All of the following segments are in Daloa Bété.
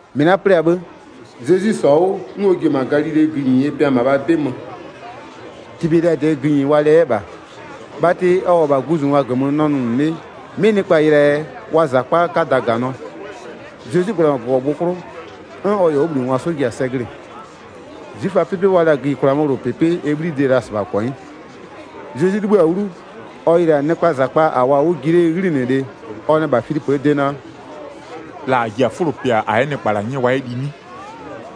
1-Mɩ la'a 'plɩ-a 'bhë, Zezwi -sɔ-a 'wʋ 'n ɔ ji-e -ma Galilee gïnyie pɩa -mabhaa 'bɩ mö. Tibeliadɩɛ gïnyi wa lɛ 'yɛ -bha. Bhatɩ ɔ -wʋ-ɔ -bha guzungwa -gömö nʋnʋ 'le 'mɩ nɩkpa yɩlɩ-aa yɛ, wa -zakpa 'kada -ganɩɔ. Zezwi -gbla-a -ma -gɔgɔgbʋ 'klʋ, 'n ɔ -yɛ ɔ 'wʋbhlinɩngwa 'sɔ ji-a sɛ glɩ-ɩ. 'Zwiföaa 'pɩpɩ wa la-a gïyikwlaa 'möwlʋpɩpɩ ɛ 'bhlibhlide-e la -sɩbha -kɔnyɩ. Zezwi 'libhïa 'wlu, ɔ yɩlɩ-a nɩkpaa -zakpa -a -wʋɔ-a 'wʋ ji 'lee 'ghlinɩlɩ-ɛ, ɔ nɛ -bha Filipöö de naa: “La -a ji-a 'fʋlo pɩa -a 'yɛ nɩkpa -la 'nyɛ wa 'yɛ li 'nɩ?”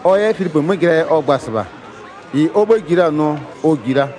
Ɔ 'yɛ Filipö 'mö jɩlaa yɛ ɔ gba-a -sɩbha, -ɩ ɔ 'bhë ji la-a nʋɔ ɔ -jiɩ la.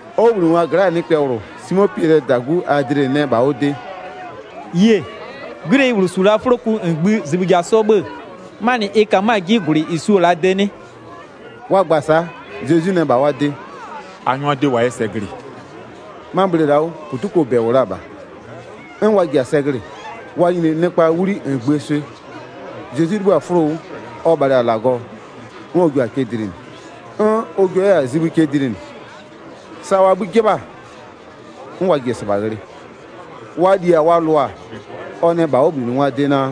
Ɔ 'wʋbhlinɩngwa gla'aa nɩkpɛ -bhlʋ, Simo Piɛlɩɛ -dagu Adle nɛ -bha ɔ de: “Yie, 'gwileyi -bhlʋ -su la'a 'fʋloku -ngbï zibhï ja 'sɔ 'bhë-ë, 'manɩ ɩ ka 'mö-a 'ji -gwlɩ -ɩ su-o -laa de 'nɩ?” Wa gba-a sa'a, Zezwi nɛ -bha wa de: “A 'nyʋa 'dɩ wa 'yɛ sɛ glɩ-ɩ.” 'Ma bhle la'aa 'wʋ -putukoo -bɛ -wʋ la-a -bha. 'N wa ji-a sɛ glɩ-ɩ, wa nyini nɩkpaa 'wli -ngbïë swɩ. Zezwi 'libhï-a 'fʋlo 'wʋ, ɔ bhalɩ-a -Lagɔ, 'n ɔ jua-a cɛ dlinɩ, 'n ɔ jua 'yɛ-a zibhï cɛ dlinɩ, sa wa 'bhï 'jɩbha-a 'n wa ji-e -sɩbha ghlɩ. Wa li-a wa lʋ-a, ɔ nɛ -bha ɔ 'wʋbhlinɩngwaa de naa: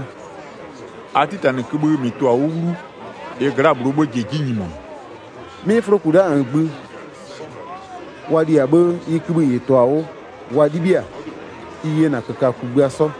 “A 'titanɩ kïbhï -mɩ tʋ-a 'wʋ 'wlu, ɩ gla'aa -bhlʋɔ 'bhë ji-e 'ji nyimonʋ.” 'Mɩ 'fʋloku la'a -ngbï, wa liɩ-a 'bhë ɩ kïbhï -ɩ tʋ-a 'wʋ wa 'libhiɩ-a, ɩ yena -köka kugbïa 'sɔ.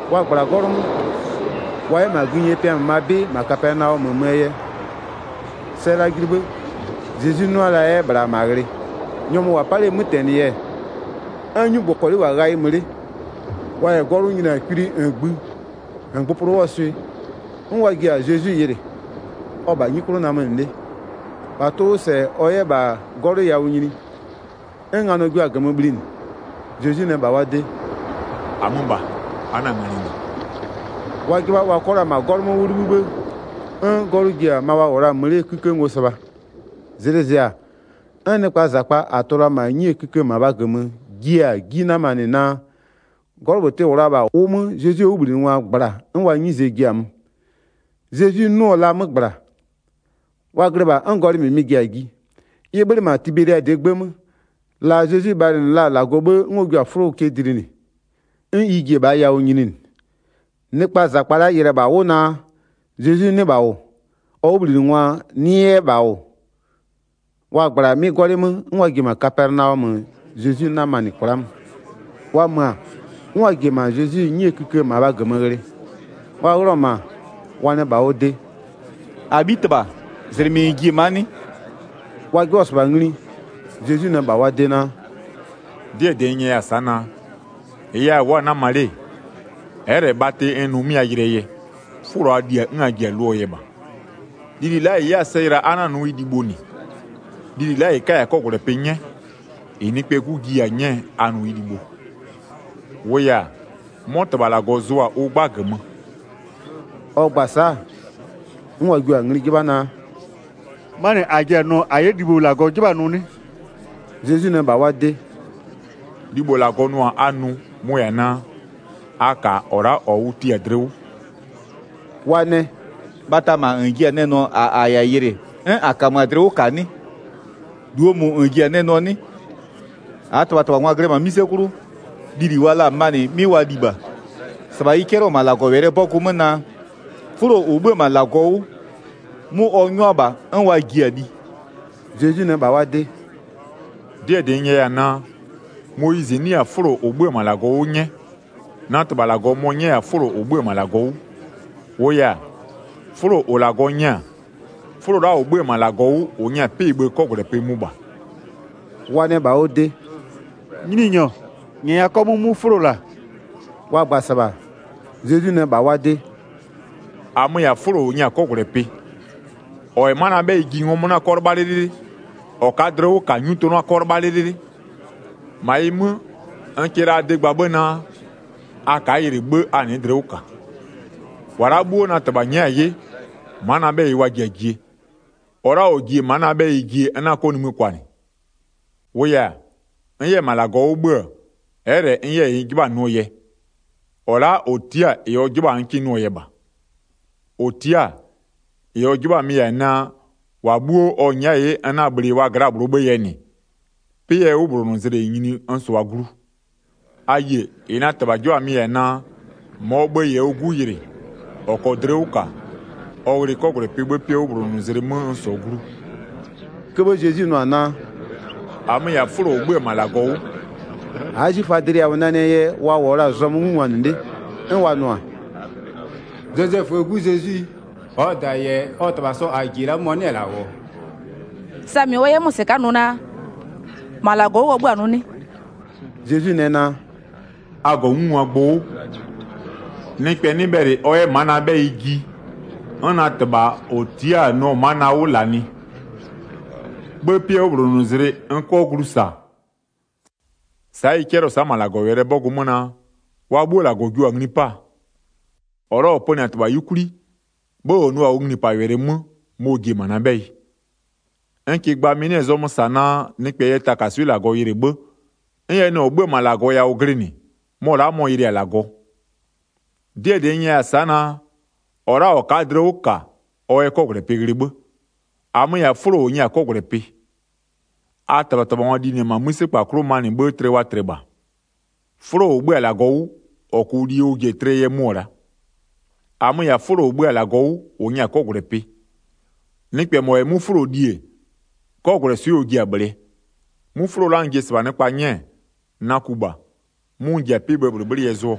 Wa -gbla-a 'gɔlʋ 'mö, 'n wa -wʋ-a 'nyi 'mö -dɩ 'le wa 'yɛ -ma gïnyie pɩa -mabhaa 'bɩ, -ma Kapɛnaɔmö möö yɛ. Sɛ yɛ la julu 'bhë, Zezwi 'nʋa-a 'yɛ -bhla -ma ghlɩ. Nyɔmʋ -ʋ -wʋ-a 'pa 'lee 'mötɛnɩ yɛ, 'n 'nyugbɔkɔlɩ -wʋ-a ghayɩ mö 'le. Wa -yɛ 'gɔlʋ nyini-a kwili -ngbï, -ngbʋpʋlʋ 'wʋɔ swɩ, 'n wa ji-a Zezwi yɩlɩ. Ɔ-ɔ -bha 'nyi 'klʋ namönɩ 'le, -bha tʋ-ʋ 'wʋ -sɛ ɔ 'yɛ -bha 'gɔlʋ yawʋ nyini, 'n nganɔ jua-a -gömö bhlinɩ. Zezwi nɛ -bha wa de: “-Amö -bha, a 'na-a nganɩ -nɩ.” Wa 'jɩbha wa 'kɔ la -ma 'gɔlʋ 'mö 'wʋ 'libhï 'bhë, 'n 'gɔlʋ ji-a ma wa -wʋ la-a mö 'lee 'kïkë ngo -sɩbha. Zlɩ zɩ-a, 'n nɩkpaa -zakpa -a tʋ-ʋ la-a -ma 'nyie kïkë -mabha -gömö jiɩ-a 'ji 'namanɩ naa, 'gɔlʋ -bhlʋ tɩ-ɩ -wʋ la-a -bha, ʋ 'mö Zezwie 'wʋbhlinɩngwa -gbla-a 'n wa 'nyize ji-a mö. Zezwi 'nʋ-ʋ la 'mö -gbla. Wa glɩ -bha 'n gɔlɩ -mɩmɩ ji-a ji, ɩ 'bhönɩ -ma Tibeliadɩɛ 'gbë 'mö, la Zezwi bhalɩnɩ la-a -Lagɔ 'bhë 'n ɔ jua-a 'fʋlo cɛ dlinɩ, 'n ɩ ji-e -bhaa yawʋ nyininɩ. Nɩkpaa -zakpa la'a yɩlɩ-ɛ -bha 'wʋ naa, Zezwi 'nɩ -bha -wʋ, ɔ 'wʋbhlinɩngwa 'nɩ 'yɛ -bha -wʋ-ɔ, wa -gbla-a 'mɩ 'gɔlɩ 'mö 'n wa ji-e -ma Kapɛnaɔmö Zezwi 'namanɩ kwla'a mö. Wa mö-a, 'n wa ji-e -ma Zezwi 'nyie kïkë -mabhaa -gömö ghlɩ. Wa ghlɩɔ-ɔ -ma, wa nɛ -bha ɔ de: “-Abhitɩbha, -zlɩmɩ -n ji-e ma'a 'nɩ?” Wa 'jɩbhɔ-ɔ -sɩbha ngli, Zezwi nɛ -bha wa de naa: “'Dɩɛ -dɩ n nyɛya-a sa'a naa: -Ɩɩ yɛ a wʋ'ʋ-a 'nama 'le, ɛ'ɛ -lɛ bhatɩ n nʋ-a 'mɩ a yɩlɩɛ yɛ, 'fʋlo a li-a 'n a jiʋ-a 'wʋ lʋɔ yɛ -bha. Lili la'a -ɩ 'yɛ-a sɛ yɩla a'a nʋ ɩ libho -nɩ, lili la'a -ɩ 'kaya-a 'kɔgwlɛpɩ 'nyɛ, -ɩ Nɩkpɛɛ 'Gu jiya-a 'nyɛɛ a nʋ ɩ libho. -Wʋʋ yɛ-a, 'mɔ -Tɩbha -Lagɔ zʋ-a ʋ 'gba -gömö.” Ɔ gba-a sa'a, 'n wa jio-a ngli 'jɩbha naa: “'Manɩ -a ji-a nʋɔ -a 'yɛ libho -Lagɔ 'jɩbha-a nʋ 'nɩ?” Zezwi nɛ -bha wa de naa: “Libho -Lagɔ nʋ-a a nʋ, mʋ-ʋ -yɛ-a naa: A -ka -ɔ la'a -ɔ ʋ tia-a dlɩ 'wʋ.” Wa nɛ: “Bhata -ma -n ji-a nɛ nʋɔ -a -a -yɛ-a yɩlɩ 'n -a -kamö-a dlɩ 'wʋ -ka 'nɩ? -Luo -mʋ -n ji-a nɛ nʋɔ 'nɩ? 31-Aa -tɩbhatɩbhangwa glɩ-ɛ -ma 'mïse 'klʋ, lili wa la-a manɩ 'mɩ wa li -bha, -sɩbha ɩ 'cɛlɩɔ-ɔ -ma -Lagɔwɛlɩɛ 'bɔgʋ 'mö naa: 'Fʋlo -ʋ 'bhö-ö -ma -Lagɔ 'wʋ, 'mʋ ɔ 'nyʋa -bha 'n wa ji-a li.” Zezwi nɛ -bha wa de: “'Dɩɛ -dɩ n nyɛya-a naa: Moyizɩ 'nɩya-a 'fʋlo -ʋ 'bhö-ö -ma -Lagɔ 'wʋ 'nyɛ, na -Tɩbha mɔ-ɔ 'nyɛya-a 'fʋlo -ʋ 'bhö-ö -ma -Lagɔ 'wʋ. 33-Wʋʋ yɛ-a, 'fʋlo -ʋ -Lagɔ nyɛ-a, 'fʋlo la'a -ʋ 'bhö-ö -ma -Lagɔ 'wʋ -ʋ nyɛ-a 'pɩ-ɩ bhë 'kɔgwlɛpɩ mʋ -bha.” Wa nɛ -bha ɔ de: “Nyininyɔ, -nyɛya 'kɔmʋʋ 'mʋ 'fʋlo -la.” Wa gba-a -sɩbha, Zezwi nɛ -bha wa de: “-Amö-ö -yɛ-a 'fʋlo -ʋ nyɛ-a 'kɔgwlɛpɩ, -ɔ -yɛ ma'a na 'bhɛyɩ ji ngɔmʋ 'na 'kɔ 'lɩbha 'lɩlɩlɩ, -ɔ ka'a dlɩ 'wʋ -ka 'nyutʋ 'na 'kɔ 'lɩbha 'lɩlɩlɩ. 36-Ma ɩ 'mö, n kɩ la a de gba 'bhë naa: A ka'a yɩlɩ 'bhë a nɩ'ɩ dlɩ 'wʋ -ka. 37-Wa la'a 'bhuo na -Tɩbha nyɛ'ɛ-a 'ye, ma'a na 'bhɛyɩ wa ji-a jie, -ɔ la'a -ɔ ji-e ma'a na 'bhɛyɩ n 'na 'kɔ nimï kwanɩ. 38-Wʋʋ yɛ-a, n 'yɛ-ɛ -ma -Lagɔ 'wʋ 'bhö-ö, ɛ'ɛ -lɛ n 'yɛ -ɩ n 'jɩbha-a nʋɔ yɛ, -ɔ la'a -ɔ tia'a-a -ɩ ɔ 'jɩbha-a n 'kɩ nʋɔ yɛ -bha. 39-Ɔ tia'a-a, -ɩ ɔ 'jɩbha-a mɩ-ɩ -yɛ-a naa: -Wa 'bhuo ɔ nyɛ'ɛ-a 'ye n 'na-a bhlɩ wa gla'a-a -bhlʋ yɛ -nɩ, 'pɩɛ 'wʋbhlonʋzlɩ 'mö n -sʋa glu. 40A yie, -ɩ na -Tɩbha 'jɩbha-a mɩ-ɩ -yɛ-a naa: -Mɔɔ bhë-ë -yɛ ɔ 'Gu yɩlɩ, -ɔ -kɔɔ dlɩ 'wʋ -ka, ɔ ghlɩ 'kɔgwlɛpɩ 'bhë 'pɩɛ 'wʋbhlonʋzlɩ 'mö n -sɔɔ glu.” 41'Köbhë Zezwi nʋ-a naa: “-Amö -yɛ-a 'fʋlo -ʋ 'bhö-ö -ma -Lagɔ 'wʋ,” a'a 'zwiföa dlɩ yawʋ nanɩɛ yɛ wa -wʋɔ la'a zɔmö 'ngungwanɩ 'le. 42'N wa nʋ-a: “Zozɛföö 'gu Zezwi, -ɔɔ -da -yɛ ɔ -tɩbha sɔ -a -ji-e la'a mɔ-ɔ 'nɩ-ɛ -la -wʋ-ɔ? Samɩ ɔ 'yɛ 'mö-a -sɩka'a nʋ naa: -Ma -Lagɔ 'wʋ ɔ 'bhö-a nʋ 'nɩ?” 43Zezwi nɛ naa: “A -gɔ 'ngungwa gbʋ 'wʋ. 44Nɩkpɛ 'nɩ bhɛlɩ ɔ 'yɛ ma'a na 'bhɛyɩ ji 'n na -Tɩbha -ɔ tia'a-a nʋɔ ma'a na 'wʋ -lanɩ, 'bhë 'pɩɛ 'wʋbhlonʋzlɩ n 'kɔ glu -sa. 45Sa'a ɩ 'cɛlɩɔ-ɔ sa'a -ma -Lagɔɔ 'mögbanɩngwaa 'bɔgʋɩ 'mö naa: Wa 'bhuo -Lagɔ jua-a ngli 'paa. -Ɔ la'a -ɔ pönɩ-a -Tɩbha 'yukwli, 'bhë -ɔ 'nʋ-a ɔ nglipawɛlɩ 'mö, mɔ-ɔ ji-e ma'a na 'bhɛyɩ. 46N -kɩɩ gba, mɩ-ɩ 'nɩ-ɛ -zɔmö -sa naa, nɩkpɛ yɛ takaswɩ'ɩ -Lagɔ yɩlɩ 'bhë, 'n ɛ nɩ -ɔ 'bhö-ö -ma -Lagɔ yawʋ glɩnɩ, mɔ la'a mɔ-ɔ yɩlɩ-a -Lagɔ. 47'Dɩɛ -dɩ n nyɛya-a sa'a naa: -Ɔ la'a -ɔ ka'a dlɩ 'wʋ -ka, ɔ yɛ 'kɔgwlɛpɩ ghlɩ 'bhë. 48-Amö-ö -yɛ-a 'fʋlo -ʋ nyɛ-a 'kɔgwlɛpɩ. 49A -tɩbhatɩbhangwa linɩ-ɛ -ma 'mïsekpa 'klʋ manɩ 'bhë tlɩ wa tlɩ -bha. 50'Fʋlo -ʋ 'bhö-a -Lagɔ 'wʋ, -ɔ -kʋʋ li ɔ ji-e tlɩɛ yɛ mʋ-ɔ la'a. 51-Amö-ö -yɛ-a 'fʋlo -ʋ 'bhö-a -Lagɔ 'wʋ, -ʋ nyɛ-a 'kɔgwlɛpɩ. Nɩkpɛ -mɔ -yɛ 'mʋ 'fʋlo li-e, 'kɔgwlɛswɩ'ɩ ɔ ji-a -bhlɩɛ. 'Mʋ 'fʋlo la'a n ji-e -sɩbha nɩkpa 'nyɛɛ, na ku -bha, 'mʋ n ji-a 'pɩ-ɩ bhëë -bhlɩbhlɩ yɛ zʋɔ.”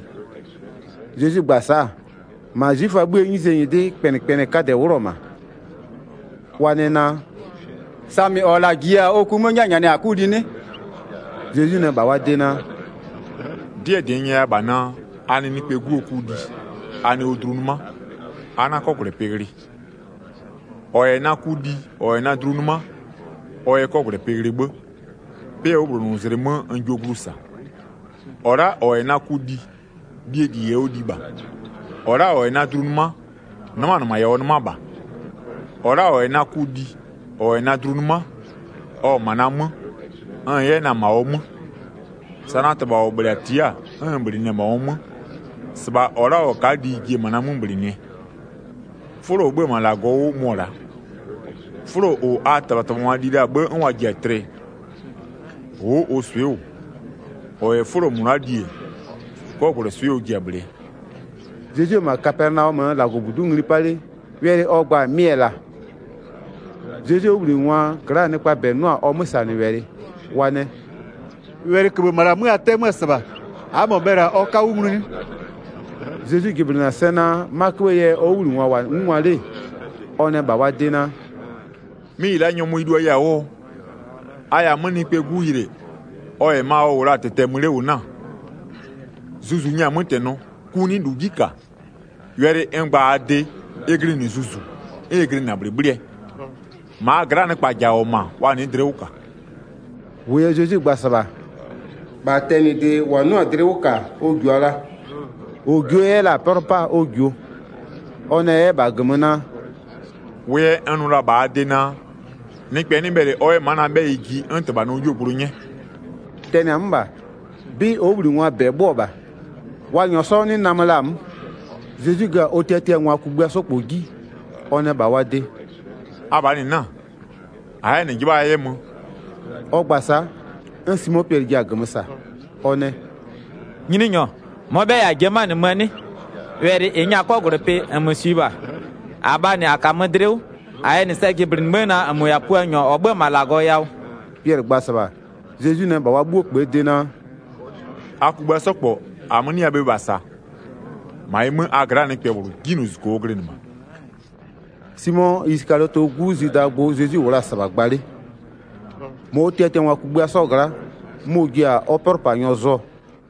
52Zezwi gba-a sa'a, -ma 'zwiföaa 'bhïë 'nyizee nyɩdɩ kpɛnɩkpɛnɩɛ 'kadɛ 'wlʋ-ɔ -ma, wa nɛ naa: “Samɩ -ɔ -la -jiya-a ɔ ku 'mö 'nyɛnyɛnɩɛ -a 'kʋ li 'nɩ?” 53Zezwi nɛ -bha wa de naa: “'Dɩɛ -dɩ n nyɛya -bha naa: A nɩ Nɩkpɛɛ 'Guo ku li, a nɩ ɔ dlu 'nɩma, a 'na 'kɔgwlɛpɩ ghlɩ. 54-Ɔ -yɛ na ku li, -ɔ -yɛ na dlu 'nɩma, ɔ yɛ 'kɔgwlɛpɩ ghlɩ 'bhë, 'pɩɛ 'wʋbhlonʋzlɩ 'mö n jio glu -sa. 55-Ɔ la'a -ɔ -yɛ na ku li, lie -li -yɛ ɔ li -bha. -Ɔ la'a -ɔ -yɛ na dlu 'nɩma, 'nɩmaa -nɩma -yɛ ɔ 'nɩma -bha. 56-Ɔ la'a -ɔ -yɛ na ku li, -ɔ -yɛ na dlu 'nɩma ɔ-ɔ -ma na 'mö, n-n 'yɛ na-a -ma ɔ 'mö. 57Sa na -Tɩbha -ɔ -bhlɩ-a tia'a-a, 'n n -bhlɩnɩ-ɛ -ma ɔ 'mö, -sɩbha -ɔ la'a -ɔ ka'a li ji-e -ma na 'mö -bhlɩnɩɛ. 58'Fʋlo -ʋ 'bhö-ö -ma -Lagɔ 'wʋ mʋ-ɔ la'a, 'fʋlo -ʋ a -tɩbhatɩbhangwa li la-a 'bhë 'n wa ji-a tlɩ, ʋ'ʋ ʋ swɩ'ɩ -wʋ. -Ɔ -yɛ 'fʋlo -mʋ la'a li-e, 'kɔgwlɛswɩ'ɩ ɔ ji-a -bhlɩɛ.” 59Zezwi -wʋ-ɔ -ma Kapɛnaɔmöö -Lagɔbudu'u ngli 'pa 'le, wɛlɩ ɔ gba-a mɩ-ɛ -la. Wɛlɩ -ɩ 'nyɛ-a 'kɔgwlɛpɩ 60Zezwie 'wʋbhlinɩngwa gla'aa nɩkpaa -bɛ 'nʋ-a ɔ 'mösanɩwɛlɩ, wa nɛ: “Wɛlɩköbhë -ma -la 'mö a 'tɛ-ɛ 'mö-ö -sɩbha, a'a -mɔ bhɛlɩ-a ɔ 'ka 'wʋ nglu 'nɩ?” 61Zezwi jɩblɩnɩ-a sɛ naa, 'ma 'köbhëë yɛ ɔ 'wʋbhlinɩngwa -wʋ-a 'ngungwa 'le-e, ɔ nɛ -bha wa de naa: “'Mɩ -ɩ la'a nyɔmʋ ɩ luaya-a 'wʋɔ? 62A -yɛ-a 'mö Nɩkpɛɛ 'Gu yɩlɩ, ɔ -yɛ ma ɔ -wʋ la-a -tɩtɛ-ɛ mö 'le -wʋ 'na-a? 63Zuzu nyɛ-a 'mötɛnɔ, ku 'nɩ -lu 'ji -ka. Wɛlɩ n gba-a la'a a de, ɩ glɩnɩ Zuzu, 'n ɩ glɩnɩ-a -bhlɩbhlɩɛ. 64-Ma a gla'a nɩkpa -ja -wʋ-ɔ -ma, wa nɩ'ɩ dlɩ 'wʋ -ka.” -Wʋʋ yɛ Zezwi gba-a -sɩbha-a, -bha tɛnɩde -wa 'nɩɔ-a dlɩ 'wʋ -ka ɔ -jua la, -ɔ jio 'yɛ la-a 'pɛlʋ 'paa ɔ -jio. 65Ɔ nɛ 'yɛ -bha -gömö naa: “Wʋ yɛ n nʋ la-a -bha a de naa: Nɩkpɛ 'nɩ bhɛlɩ ɔ 'yɛ ma'a na 'bhɛyɩ ji 'n -Tɩbha nɩɔ 'yuogblʋ 'nyɛ.” 66Tɛnɩ-a 'mö -bha, 'bɩ ɔ 'wʋbhlinɩngwaa -bɛ 'bhö-öɔ -bha, wa -nyɔɔ 'sɔ 'nɩ namö la-a 'mö. 67Zezwi gö-a ɔ tiatiangwa kugbïa 'sɔ -kpɔ 'ji, ɔ nɛ -bha wa de: “Abhaa -nɩ 'na-a? A'a-a 'yɛ -nɩ 'jɩbha a 'yɛ möö?” 68Ɔ gba-a sa'a, 'n Simo Piɛlɩ ji-a -gömö -sa. Ɔ nɛ: “Nyininyɔ, -mɔɔ 'bhɛyɩ -a ji-e 'mö-a möö 'nɩ? Wɛlɩ -ɩ nyɛ-a 'kɔgwlɛpɩ, -nmö -swiɩ -bha. 69-Abhaa -nɩ -a -kamö dlɩ 'wʋ, -a yɛ -nɩ sɛ jɩblɩnɩ 'bhë naa: -nmö -yɛ-a Puanyɔ -ɔ 'bhö-ö -ma -Lagɔ yawʋ.” 70Piɛlɩ gba-a -sɩbha, Zezwi nɛ -bha wa 'bhuo -kpöö de naa: “A kugbïa 'sɔ -kpɔ -amö-ö 'nɩya bhe -bha -saa? -Ma ɩ 'mö, -ma a gla'aa nɩkpɛ -bhlʋ, 'jinylozuzuko ɔ glɩnɩ -bha.” 71Simo Isɩkaliɔtɩɛ 'gu Zwidaa gbʋ Zezwi -wʋ la-a -sɩbha gba 'le. -Ma ɔ tiatiangwa kugbïa 'sɔɔ gla'a, mɔ-ɔ ji-a ɔ 'pɛlʋpanyɔ zʋɔ.